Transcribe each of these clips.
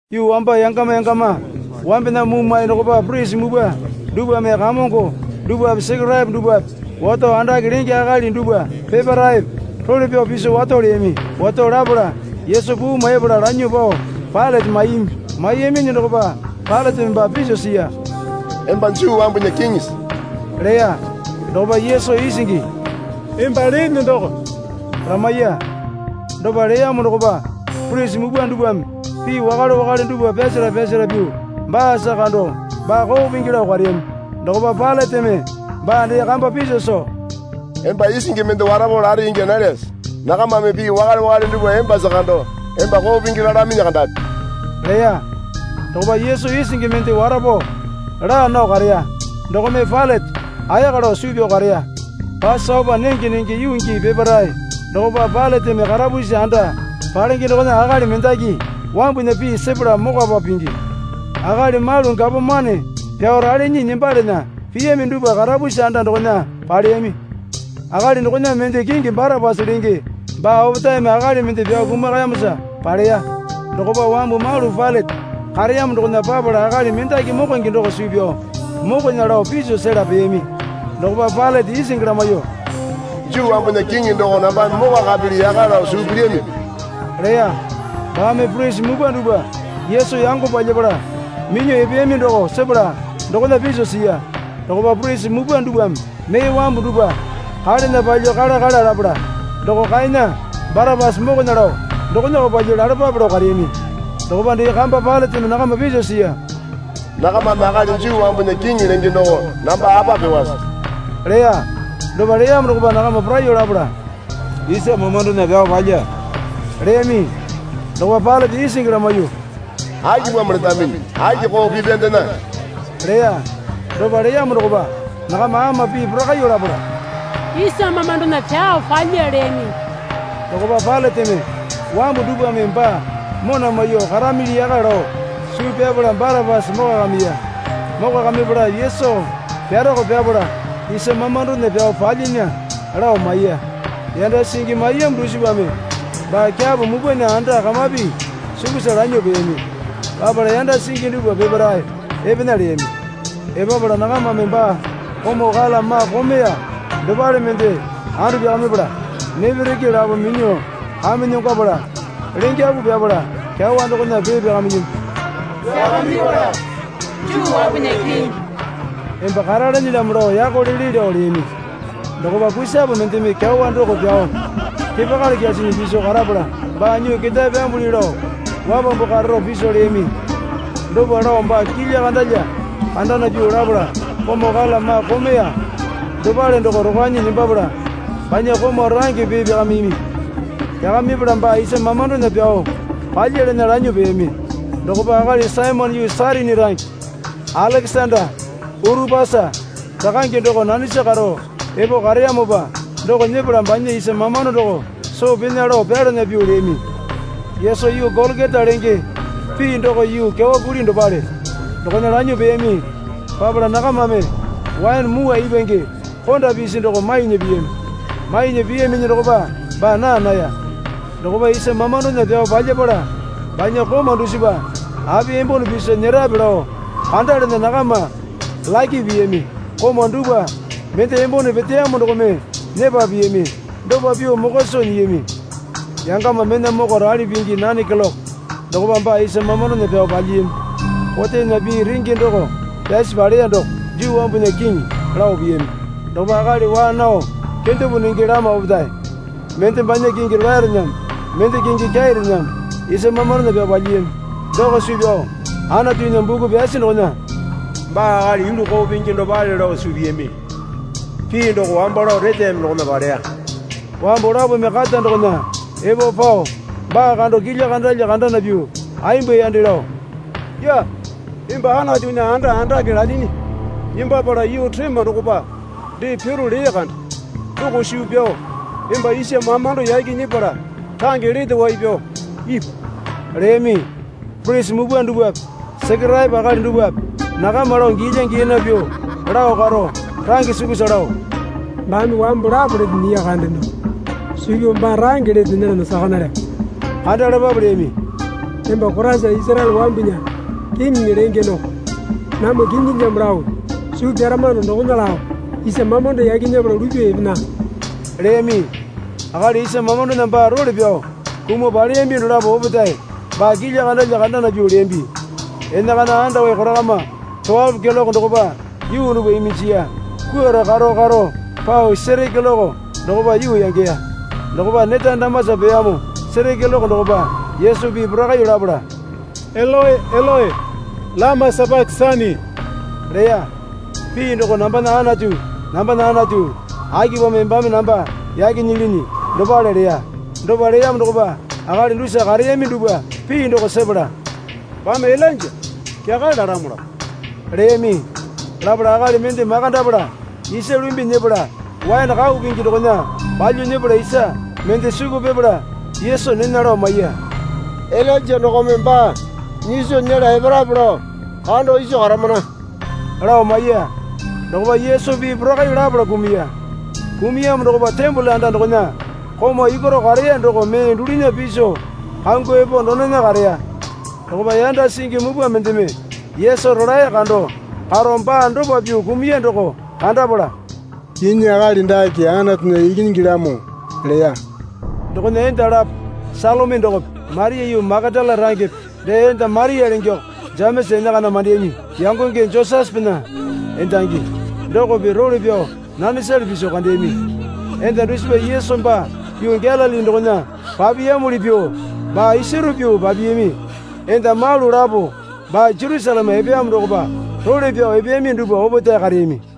Yuu wamba yangama yangama wambena mumwa dokopa purisi mupwa dupwame kamongo dupwape Sekeraepo dupwape wato andake lenge akali dupwa peparaepe role pyao piso wato leyami. Wato lapala Yesu puu maipala lanyuo pao Pailate maiyami. Maiyaminyi dokopa Pailateme baa piso siya. Emba Juu wambunya Kiŋisi? leya. Dokopa Yesu isingi, Emba lene doko, lamaiya. Dopa leyamo dokopa purisi mupwa dupwame pii wakale wakale dupwa pyasara pyasara pyuo baasa kando baa koo pingi lao kareyami. Dokopa Pailateme baa dee kamba piso soo, Emba isingi mende warapo lare ingya nalyase? Nakamame pii wakale wakale dupwa embasa kando emba koo pingi lalaminyi kandapi, leya. Dokopa Yesu isingi mende warapo laa nao kareya dokome Pailate ayaka lao suu pyao kareya. Pasopa nenge nenge yuu gii peparae dokopa Pailateme karapusi anda palenge dokona akali mendaki wambunya pii sepala mokwapa pingi. Akali malu gapomane pyao ralinyi nembalana piyami dupwa karapusi anda dokona paleyami. Akali dokona mende kingi Barapasa lenge baa opetaeme akali mende pyao kumakayamosa paleya. Dokopa wambu malu Pailate kareyamo dokona papala akali mendaki mokonge doko suu pyao mokona lao piso sela peyami. Dokopa Pailate isingi lamaiyuo, Juu wambunya Kiŋi doko nambame mokwakapili yaka lao suu pilyamipi? leya. Baame purisi mupwa dupwa Yesu yango palyapala minyuo epeyami doko sepala dokona piso siya. Dokopa purisi mupwa dupwame mee wambu dupwa kalena palyuo kala kala lapala, Doko kaena, Barapasa mokona lao dokonako palyuo lalapape lao kareyami. Dokopa dee kamba Pailateme nakama piso siya. Nakamame akali Juu wambunya Kiŋi lenge doko namba apa pyuowase? leya. Dopa leyamo dokopa nakama poraiyuo lapala, Isa mamandona pyao palya, leyami. Dokopa Pailate isingi lamaiyuo, Akipamo letaminyi? Aki koo pipyandena? leya. Dopa leyamo dokopa nakama ama pii porakaiyuo lapala, Isa mamandona pyao palya, leyami. Dokopa Pailateme wambu dupwame baa mona maiyuo karamili yaka lao suu pyapala Barapasa mokwakamiya. Mokwakamipala Yesu pyarako pyapala isa mamandona pyao palyinya, lao maiya. Yanda singi maiyamo dusipame baa kyapo mupwana anda kamapi sukusa lanyuo peyami. Papala yanda singi dupwa peparae epena leyami. Epapala nakamame baa komau kala maa komeya dopale mende andu pyakamipala nepereke lapome minyuo kamenyongwapala lengapu pipala kyawa dokona pee pyakamiyami. Pyakamipala Juu wambunya Kiŋi, emba karalenelyamo lao yako lele lao leyami. Dokopa kusape mendeme kyawa doko pyao kepakali kyasinyi piso karapala baa nyuo ketae pyambuli lao wapambu kararo piso leyami. Dopa lao baa kilya kandalya kandana pyuo lapala komau kala maa komeya dopale doko rokwanyi nembapala banya komau range pee pyakamiyami. Pyakamipala baa isa mamandona pyao palyalana lanyuo peyami. Dokopa akali Saimone yuu Sairini range Alekesanda Urupasa rakange doko nanesa karo epo kareyamopa doko nyepala banya isa mamando doko soo pena lao pyalana pyuo leyami. Yesu yuu Golokota lenge (pii doko yuu kyawa kuli dopale) dokona lanyuo peyami. Papala nakamame waene mwua ipwange konda pisi doko mainya piyami. Mainya piyaminyi dokopa baa naa naya. Dokopa isa mamandona pyao palyapala banya komau dusipa api embone piso nyerape lao kandalana nakama lake piyami. Komau dupwa mende embone peteyamo dokome nyepa piyami, dopa pyuo mokwa soo nyiyami. Yangama mena moko rali pingi nane keloke dokopa baa isa mamandona pyao palyiyami. Kotena pii renge doko pyasi paleya doko, Juu wambunya Kiŋi, lao piyami. Dokopa akali waa nao kendepo nenge lama opetae, mende banya kingi rolaerename, mende kingi kyairename, isa mamandona pyao palyiyami. Doko suu pyao Anatunya buku pyasi dokona, Baa akali yulu koo pingi dopale lao suu piyami, pii doko wambo lao reteyami dokona paleya. Wambu lapome kata dokona epo pao baa kando kilya kandalya kandana pyuo ayemba yande lao, Yee, emba Anatunya anda andake lalyinyi nembapala yuu rema dokopa dee piro lee kande doko suu pyao emba isa mamando yaki nyepala range lete wai pyao ipu leyami. Purisi mupwa dupwape Sekeraepo akali dupwape nakama lao giyalya giyana pyuo lao karo, range sukusa lao, Baame wambu lapo lete nyiya kande doko suu pyao baa range lete nyelana saka nalyamo, kandalapape leyami. Emba Koraisa Isaraele wambunya Kiŋiŋi lenge doko namwa kinyilamo lao suu pyaramano dokona lao isa mamando yaki nyepala lupyuo epena, leyami. Akali isa mamandona baa role pyao kumuo paleyami dolapo opetae baa kilya kandalya kandana pyuo leyambi. Enakana andawai korakama towalo keloke dokopa yuu dupwa iminjiya. Kwuarao karo karo pao seri keloke dokopa yuu yangeya. Dokopa neta damasa peyamo seri keloke dokopa Yesu pii porakaiyuo lapala, Eloe, Eloe, lama sapakesani, leya. (Pii doko Nambana Anatu, nambana Anatu, akipamo embame namba yake nyilinyi? dopale leya.) Dopa leyamo dokopa akali dusa kareyami dupwa pii doko sepala, Baame Ilainja kyakale lalamolamo, leyami. Lapala akali mende makandapala isa lumbi nyepala waene kau pingi dokona palyuo nyepala isa mende suku pipala Yesu nena lao maiya. Ilainja dokome baa nyiso nyela eparape lao kando iso karamana, lao maiya. Dokopa Yesu pii porakaiyuo lapala kumuya. Kumuyamo dokopa tembole anda dokona komau yukwaro kareya doko mee dulunya piso kangwao epo donena kareya. Dokopa yanda singi mupwa mendeme Yesu rolae kando karo baa dopa pyuo kumuya doko kandapala, Kinyi, akali dake Anatunya ikinyingilamo, leya. Dokona enda lapo Salomi dokope, Maria yuu Makatala rangepe dee enda Maria lengeko Jemesa enakana mandeyami yangonge Josesepena endangi dokope role pyao nanesale piso kandeyami. Enda dusipa Yesu baa yuu Galili dokona papiyamuli pyuo baa isaro pyuo papiyami. Enda malu lapo baa Jerusaleme epeyamo dokopa role pyao epeyami dupwa opetae kareyami.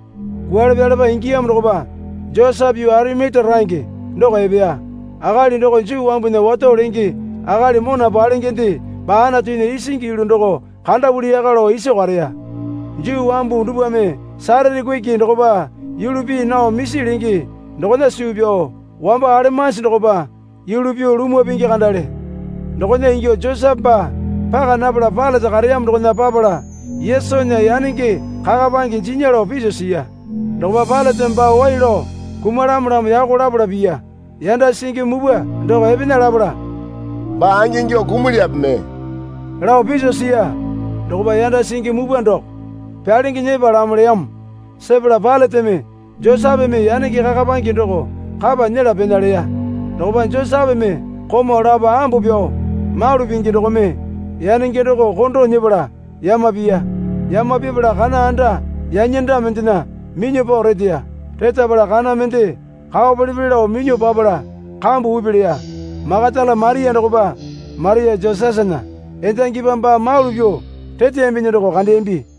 Kwualepalepa ingiyamo dokopa Josepe yuu Arimatia range doko epeya. Akali doko Juu wambunya wato lenge akali mona palengende baa Anatunya isingi yulu doko kandapuli yaka lao iso kareya. (Juu wambu dupwame Satate kuki dokopa yulu pii nao misi lenge dokona suu pyao wambo alemanji dokopa yulu pyuo lumwa pingi kandale.) Dokona ingyuo Josepe baa paka napala Pailate kareyamo dokona papala Yesunya yanenge kakapange jinya lao piso siya. Dokopa Pailateme baa waiya lao kumalamolamo yako lapala piya. Yanda singi mupwa doko epena lapala, Baa angingyuo kumulyape mee? lao piso siya. Dokopa yanda singi mupwa doko. Pyalenge nyepalamo, leyamo sepala Pailateme Josepeme yanenge kakapange doko kapa nyela pena leya. Dokopa Josepeme komau lapo ambo pyao malu pingi dokome yanenge doko kondo nyepala yama piya. Yama pipala kana anda yanyanda mendena minyuo pao reteya. Retapala kana mende kao pele pele lao minyuo papala kambu upi leya. Makatala Maria dokopa Maria Josesena endangipa baa malu pyuo reteyaminyi doko kandeyambi.